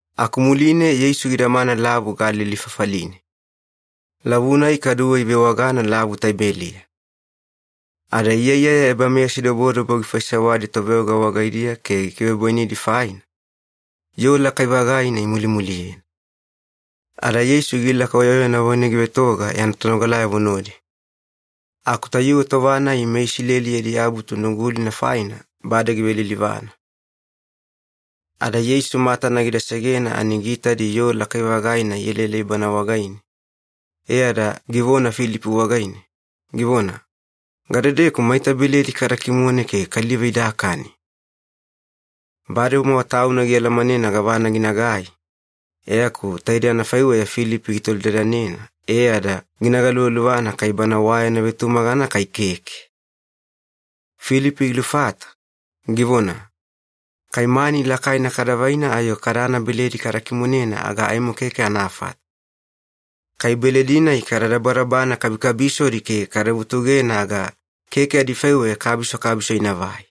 Aku muline Yeisu gidamana Lavu Galili fafaline. Lavu-nai kaduwe ivewagana Lavu Taibeliya. Ada iyaiyaya ebameyasidobodobo gifaisewadi toveoga wagaidiya ke gikivebwainidi faina, yoo lakai-vagaina imulimuliyena. Ada Yeisu gilaka oyaoyana wagaine givetoga yana tonogalayavo nodi. Aku tayuwe tova-nai meIsileli yadi Abutu Nugulina faina bade givelilivana. Ada Yeisu matana gida segena ani giitadi yoo lakai-vagaina ielaelai Bana wagaine, e ada givona Filipi wagaine, givona, “Gadedeku maita beledi kada kimone ke kaliva idakani?” Bademowa Tauna gialamanena gavana ginagai, e aku taide anafaiweya Filipi gitolidadanena e ada gina galuvaluvana kai bana wa yana vetumagana kai keke. Filipi gilufata, givona, “Kai mani lakaina kada vaina ayo kadana beledi kada kimonena aga aimo keke anafata. Kai beledi-nai kada dabadabana kabikabisodi ke kada vutugena aga keke adifaiweya kabiso kabiso inavai.”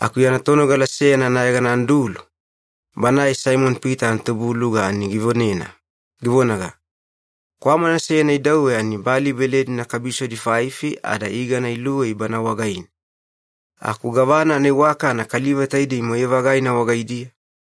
Aku yana tonogala seyana anayegana Andulu, banae Saimoni-Pita anatubuluga ani givonena, givonaga, “Kwamana seyana idauwe ani bali beledina kabisodi faifi ada igana iluwei bana wagaine. Aku gavana anaiwakana kaliva taidei moyai-vagaina wagaidiya?”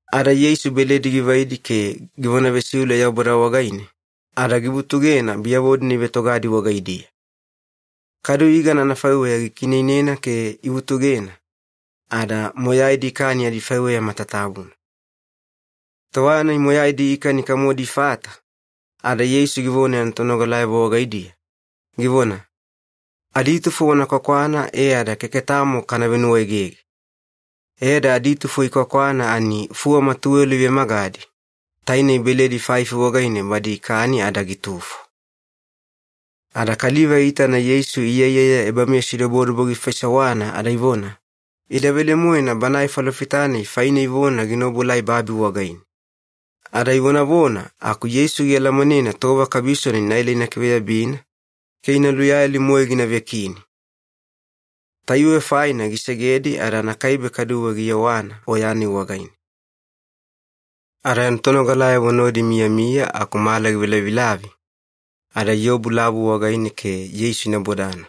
Ada Yeisu beledi givaidi ke givona vesiule Yaubada wagaine, ada givutugena biyavo-dina ivetogadi wagaidiya. Kadu igana anafaiweya gikiineinena ke ivutugena, ada moyaidi ikani adifaiweya matatabuna. Tova-nai moyaidi ikani kamodi ifata, ada Yeisu givona yana tonogalayavo wagaidiya, givona, “Aditufo wana kwakwana e ada keke tamo kana venuwaegege.” E ada aditufo ikwakwana ani fuwama tuwelo ivemagadi, tainei beledi faifi wagaine badi ikani ada gitufo. Ada kaliva iitana Yeisu iyaiyaya ebameyasidobodobo gifaisewana ada ivona, “Ida velemoena Banae Falofita-nai faine ivona gina obuelai babi wagaine.” Ada ivonavona aku Yeisu gialamanena tova kabisona inaela ina kiveyabina ke ina luyayali-moe gina vekini. Tayuwe faine gisegedi ada anakaibe kaduwe giyewana oya-nai wagaine. Ada yana tonogalayavo nodi imiyamiya aku mala givelavilavi, ada iobu lavu wagaine ke Yeisu ina bodana.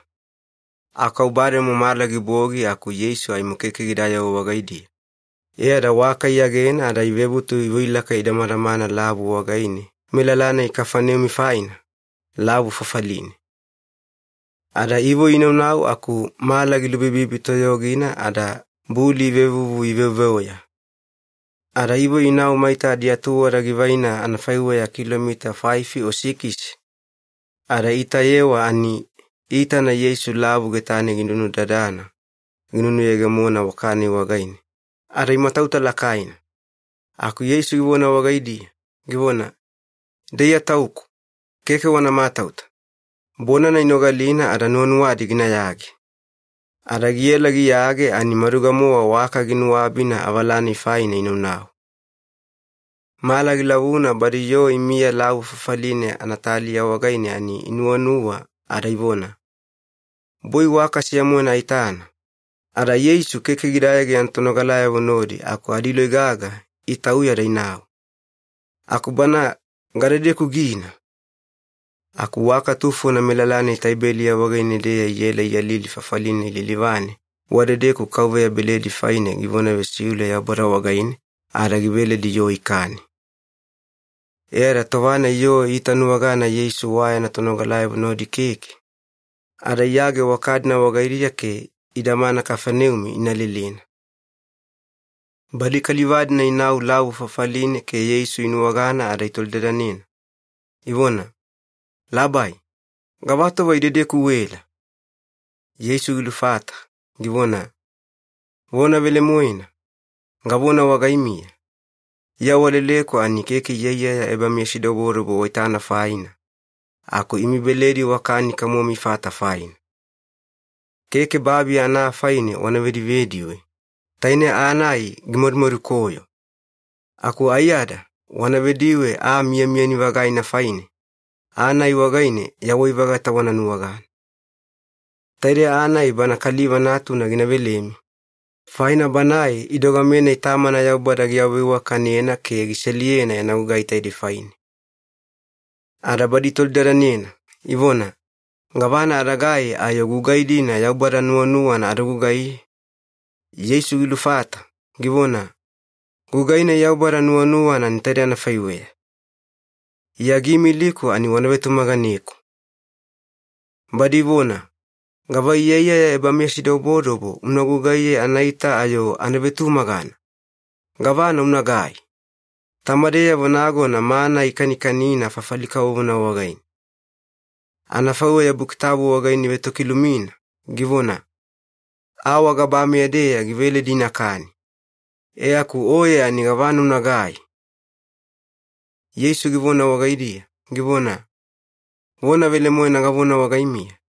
Aku au bademo mala gibogi aku Yeisu aimo keke gidayewa wagaidiya, e ada waka iyagena ada ivebutu ivoi ilaka idamadamana lavu wagaine melala-nai Kafaneumi faina, lavu fafaline. Ada ivoi inaunau aku mala gilubibibi toyogina ada buli ivevuvu iveveoya. Ada ivoi inau maita adiatuwada givaina anafaiweya kilomita faifi o sikisi, ada iitayewa ani iitana Yeisu lavu getane ginunudadana ginunuyegemona waka-nai wagaine, ada imatauta lakaina. Aku Yeisu givona wagaidiya, givona, “Ida Iya Tauku. Keke wana matauta.” Bonana inogalina ada nuwanuwadi ginayage. Ada giela giyage ani maduga-mowa waka ginuabina avala-nai faina inaunau. Mala gilavuna badi yoo imiya lavu fafaline anataliya wagaine ani inuwanuwa ada ivona, “Boi waka seya-moena aitana, ada Yeisu keke gidayage yana tonogalayavo nodi aku adiloi gaga itauya ada inau. Aku bana gadedeku gina?” Aku waka tufona melala-nai Taibeliya wagaine-deya iela iyalili fafali-nai lilivane wadedeku Kauveya beledi faine givona vesiule Yaubada wagaine ada giveledi yoo ikani. E ada tova-nai yoo iitanuwagana Yeisu wa yana tonogalayavo nodi keke, ada iyage waka-dina wagaidiya ke idamana Kafaneumi ina lelena. Badi kaliva-dina inau lavu fafaline ke Yeisu inuwagana ada itolidadanena, ivona, “Labai, gavatova idedeku uela?” Yeisu gilufata, givona, “Vona velemoena, gavona wagaimiya, Iya waleleku ani keke iyaiyaya ebameyasidobodobo waitana faina, aku imi beledi wakani kamomi ifata faina. Keke babi ana aa faine wana vedivediwe, taine aa-nai gimadumadukoyo. Aku aiyada wana vediwe aa miyamiyani-vagaina faine, aa-nai wagaine yawai-vagata wana nuwagana. Taidei aa-nai Bana Kaliva Natuna gina velemi, faina Banae idogame-nai Tamana Yaubada giawaveiwakanena ke giseliyena yana gugai taidei faine.” Ada badi itolidadanena, ivona, “Gavana adagai ayo gugai-dina Yaubada nuwanuwana ada gugaiye?” Yeisu gilufata, givona, “Gugai-nai Yaubada nuwanuwana ani taidei anafaiweya. Iya giimiliku ani wana vetumaganeku.” Badi ivona, “Gava iyaiyaya ebameyasidobodobo una gugaiye anaita ayo ana vetumagana? Gavana unagai? Tamadeyavo nagona mana ikanikanina fafali kavovona wagaine. Anafaiweya Buki Tabu wagaine ivetokilumina, givona, ‘Aa wagabameya-deya giveledi inakani.’ E aku oye ani gavana unagai?” Yeisu givona wagaidiya, givona, “Vona velemoena gavona wagaimiya,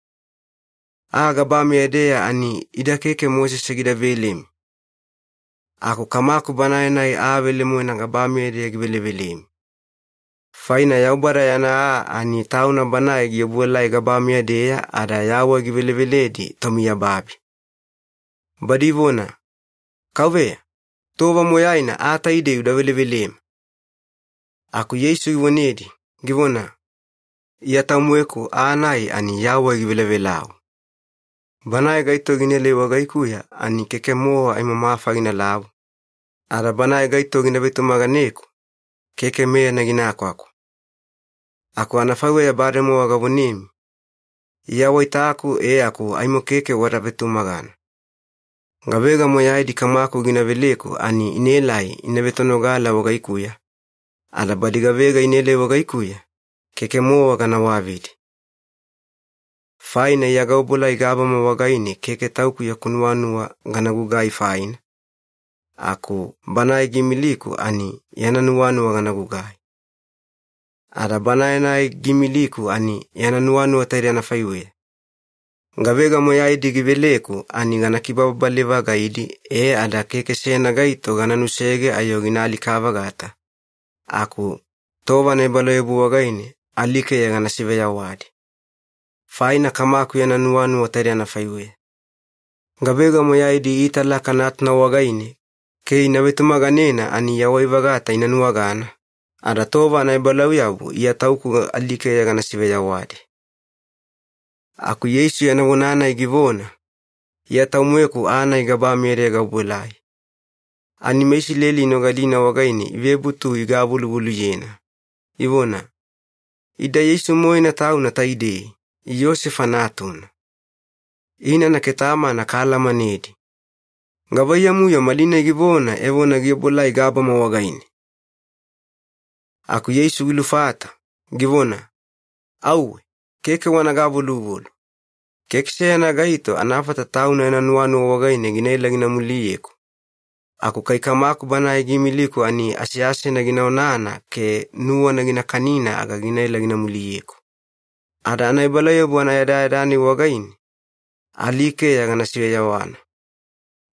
aa gabameya-deya ani ida keke Mosese gida velemi, aku Kamaku Banae-nai aa velemoena gabameya-deya givelevelemi. Faina Yaubada yana aa ani Tauna Banae giobuelai gabameya-deya ada yawai giveleveledi tomiyababi.” Badi ivona, “Kauveya, tova moyaina aa taidei uda velevelema.” Aku Yeisu givonedi, givona, “Iya Tau-moeku aa-nai ani yawai givelavelau. Banae gaito ginaelai wagaikuya ani keke-mowa aimo mafa ginalavu, ada banae gaito gina vetumaganeku, keke meyana gina kwakwa. Aku anafaiweya bademowa gavonemi, Iya waitaku e aku aimo keke wada vetumagana. Gavega moyaidi Kamaku gina veleku ani inaelai ina vetonogala wagaikuya, ada badi gavega inaelai wagaikuya, keke-mowa gana wavidi. Faina Iya gaobuelai gabama wagaine keke Tauku yaku nuwanuwa gana gugai faina, aku Banae giimiliku ani yana nuwanuwa gana gugai. Ada Banae-nai giimiliku ani yana nuwanuwa taidei anafaiweya. Gavega moyaidi giveleku ani gana kibababale-vagaidi e ada keke seyana gaito gana nusege ayo gina alika-vagata, aku tova anaebalauyabu wagaine alikeya gana siveyawadi. Faina Kamaku yana nuwanuwa taidei anafaiweya. Gavega moyaidi iitalaka Natuna wagaine ke ina vetumaganena ani yawai-vagata ina nuwagana, ada tova anaebalauyabu Iya Tauku alikeya gana siveyawadi.” Aku Yeisu yana vona-nai givona, “Iya Tau-moeku aa-nai gabameya-deya gaobuelai.” Ani meIsileli inogalina wagaine ivebutu igavoluvoluyena, ivona, “Ida Yeisu-moena Tauna taidei, Iyosefa natuna. Inana ke tamana kaalamanedi. Gavaiyamu-yo malinai givona evona giobuelai gabama wagaine?” Aku Yeisu gilufata, givona, “Auwe, keke wana gavoluvolu. Keke seyana gaito anafata tauna yana nuwanuwa wagaine ginaela gina muliyeku, aku kai Kamaku Banae giimiliku ani aseasena gina onana ke nuwana gina kanina aga ginaela gina muliyeku. Ada ebalauyabu anayadayada-nai wagaine alikeya gana siveyawana.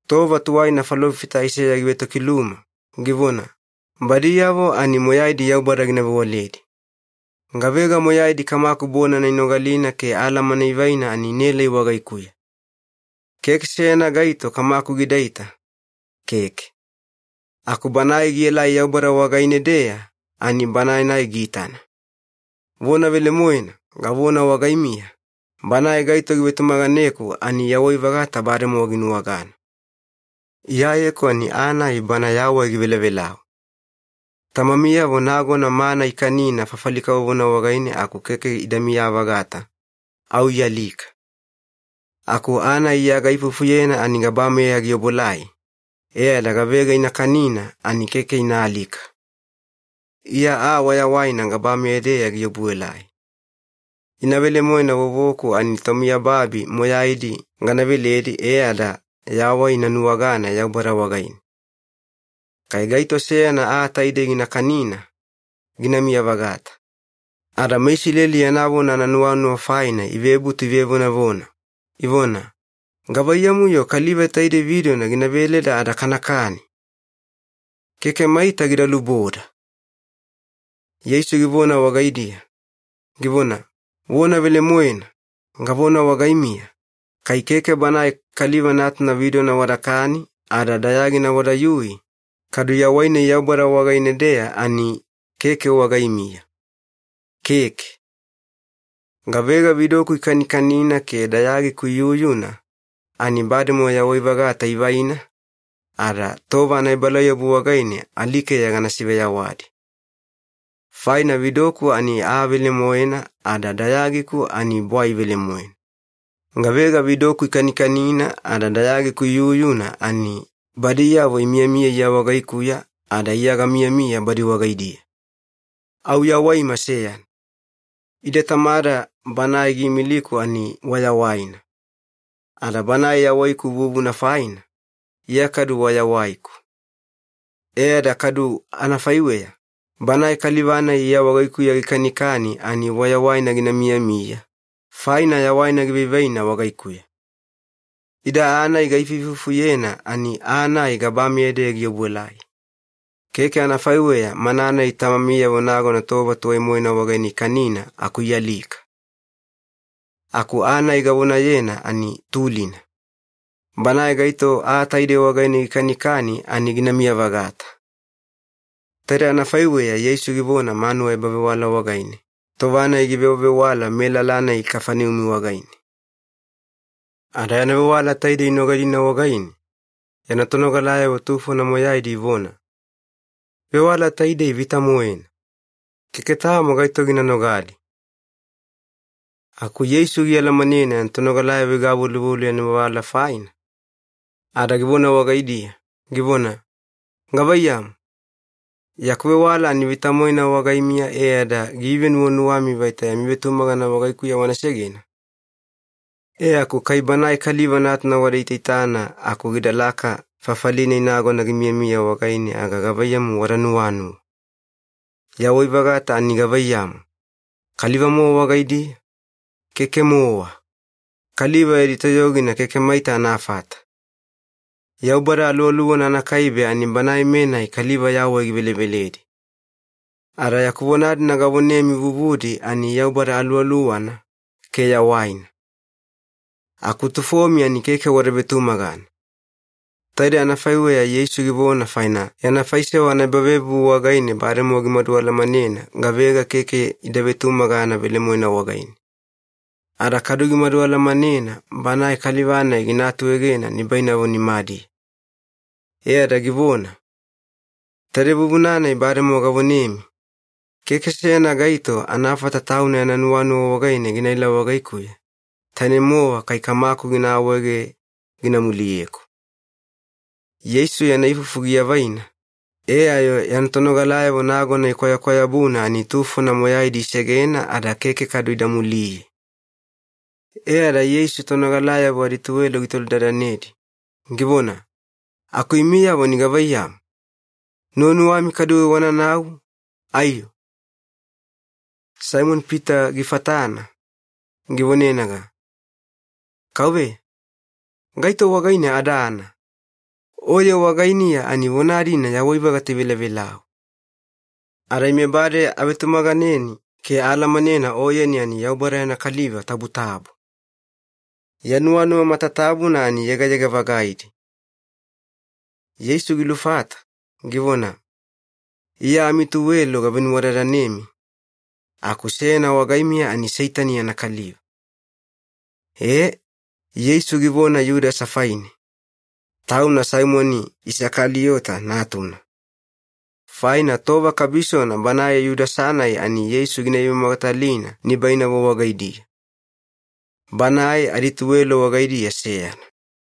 Tova tuwaina falofita Aiseya givetokiluma, givona, ‘Badiyavo ani moyaidi Yaubada gina vewaledi.’ Gavega moyaidi Kamaku bonana inogalina ke alamana ivaina ani inaelai wagaikuya. Keke seyana gaito Kamaku gidaita, keke. Aku Banae gielai Yaubada wagaine-deya ani Banae-nai giitana. Vona velemoena, gavona wagaimiya, banae gaito givetumaganeku ani yawai-vagata bademowa ginuwagana. Iyayeku ani aa-nai bana yawai givelavelau. Tamamiyavo nagona mana ikanina fafali kavovona wagaine aku keke idamiya-vagata, au ialika. Aku aa-nai Iya gaifufuyena ani gabameya giobuelai, e ada gavega ina kanina ani keke ina alika. Iya aa wayawaina gabameya-deya giobuelai. Ina velemoena vovoku ani tomiyababi moyaidi gana veledi e ada yawai ina nuwagana Yaubada wagaine. Kai gaito seyana aa taidei gina kanina, ginamiya-vagata.” Ada meIsileli yana vona ananuwanuwa faina ivebutu ivevonavona, ivona, “Gavaiyamu-yo kaliva taidei vidona gina veleda ada kanakani? Keke maita gida luboda!” Yeisu givona wagaidiya, givona, “Vona velemoena, gavona wagaimiya, kai keke Banae Kaliva Natuna vidona wadakani ada dayagina wadayui, kadu yawai-nai Yaubada wagaine-deya ani keke wagaimiya. Keke. Gavega vidoku ikanikanina ke dayagiku iyuyuna ani bademowa yawai-vagata ivaina, ada tova anaebalauyabu wagaine alikeya gana siveyawadi. Faina vidoku ani aa velemoena ada dayagiku ani bwai velemoena. Gavega vidoku ikanikanina ada dayagiku iyuyuna ani badiyavo imiyamiya Iya wagaikuya ada Iya gamiyamiya badi wagaidiya. Au yawaima seyana. Ide Tamada Banae giimiliku ani wayawaina. Ada Banae yawaiku vuvuna faina, Iya kadu wayawaiku. E ada kadu anafaiweya, banae kaliva-nai Iya wagaikuya gikanikani ani wayawaina gina miyamiya, faina yawaina givaivaina wagaikuya. Ida aa-nai gaifuifufuyena ani aa-nai gabameya-deya giobuelai. Keke anafaiweya mana-nai tamamiyavo nagona tova tuwai-moena wagaine ikanina aku ialika. Aku aa-nai gavonayena ani tulina. Banae gaito aa taidei wagaine gikanikani ani ginamiya-vagata.” Taidei anafaiweya Yeisu givona manuwa ebavewala wagaine, tova-nai givewavewala melala-nai Kafaneumi wagaine. Ada yana vewala taidei inogalina wagaine, yana tonogalayavo tufona moyaidi ivona, “Vewala taidei vita-moena. Keke tamo gaito gina nogali.” Aku Yeisu gialamanena yana tonogalayavo igavoluvolu yana vewala faina, ada givona wagaidiya, givona, “Gavaiyamu, yaku vewala ani vita-moena wagaimiya e ada giivenuwanuwami vaita yami vetumagana wagaikuya wana segena? E aku kai Banae Kaliva Natuna wada itaitana aku gidalaka fafali-nai nagona gimiyamiya wagaine aga gavaiyamu wada nuwanuwa? Yawai-vagata ani gavaiyamu, kaliva-mowa wagaidiya? Keke-mowa. Kaliva yadi toyogina keke maita anafata. Yaubada Aluwaluwana anakaibe ani Banae-menai kaliva yawai giveleveledi. Ada yaku vona-dina gavonemi vuvudi ani Yaubada Aluwaluwana, ke yawaina. Aku tufomi ani keke wada vetumagana.” Taidei anafaiweya Yeisu givona faina yana faisewa anaebavevuvu wagaine bademowa gimadu alamanena gavega keke ida vetumagana velemoena wagaine. Ada kadu gimadu alamanena bana kaliva-nai gina atuegena nibainavo nimadiya. E ada givona, “Taidei vuvuna-nai bademowa gavonemi, ‘Keke seyana gaito anafata tauna yana nuwanuwa wagaine ginaela wagaikuya, tainei-mowa kai Kamaku gina awaege gina muliyeku.’” Yeisu yana ifufu giavaina, e ayo yana tonogalayavo nagona ikwayakwayabuna ani tufona moyaidi isegena ada keke kadu ida muliye. E ada Yeisu tonogalayavo adituwelo gitolidadanedi, givona, “Aku imiyavo ani gavaiyamu, nuwanuwami kaduwe wananau, aiyo?” Saimoni-Pita gifatana, givonenaga, “Kauveya, gaito wagaine adana? Oye wagainiya ani vona-dina yawai-vagata ivelavelau. Ada ime bade avetumaganeni ke aalamanena Oyeni ani Yaubada yana Kaliva Tabutabu. Ya nuwanuwa matatabuna ani yegayega-vagaidi.” Yeisu gilufata, givona, “Iya amituwelo gavenuwadadanemi, aku seyana wagaimiya ani Seitani yana kaliva.” E, Yeisu givona Yudasa faine, tauna Saimoni Isakaliyota natuna, faina tova kabisona banae Yudasa-nai ani Yeisu gina ivemogatalina nibainavo wagaidiya. Banae adituwelo wagaidiya seyana.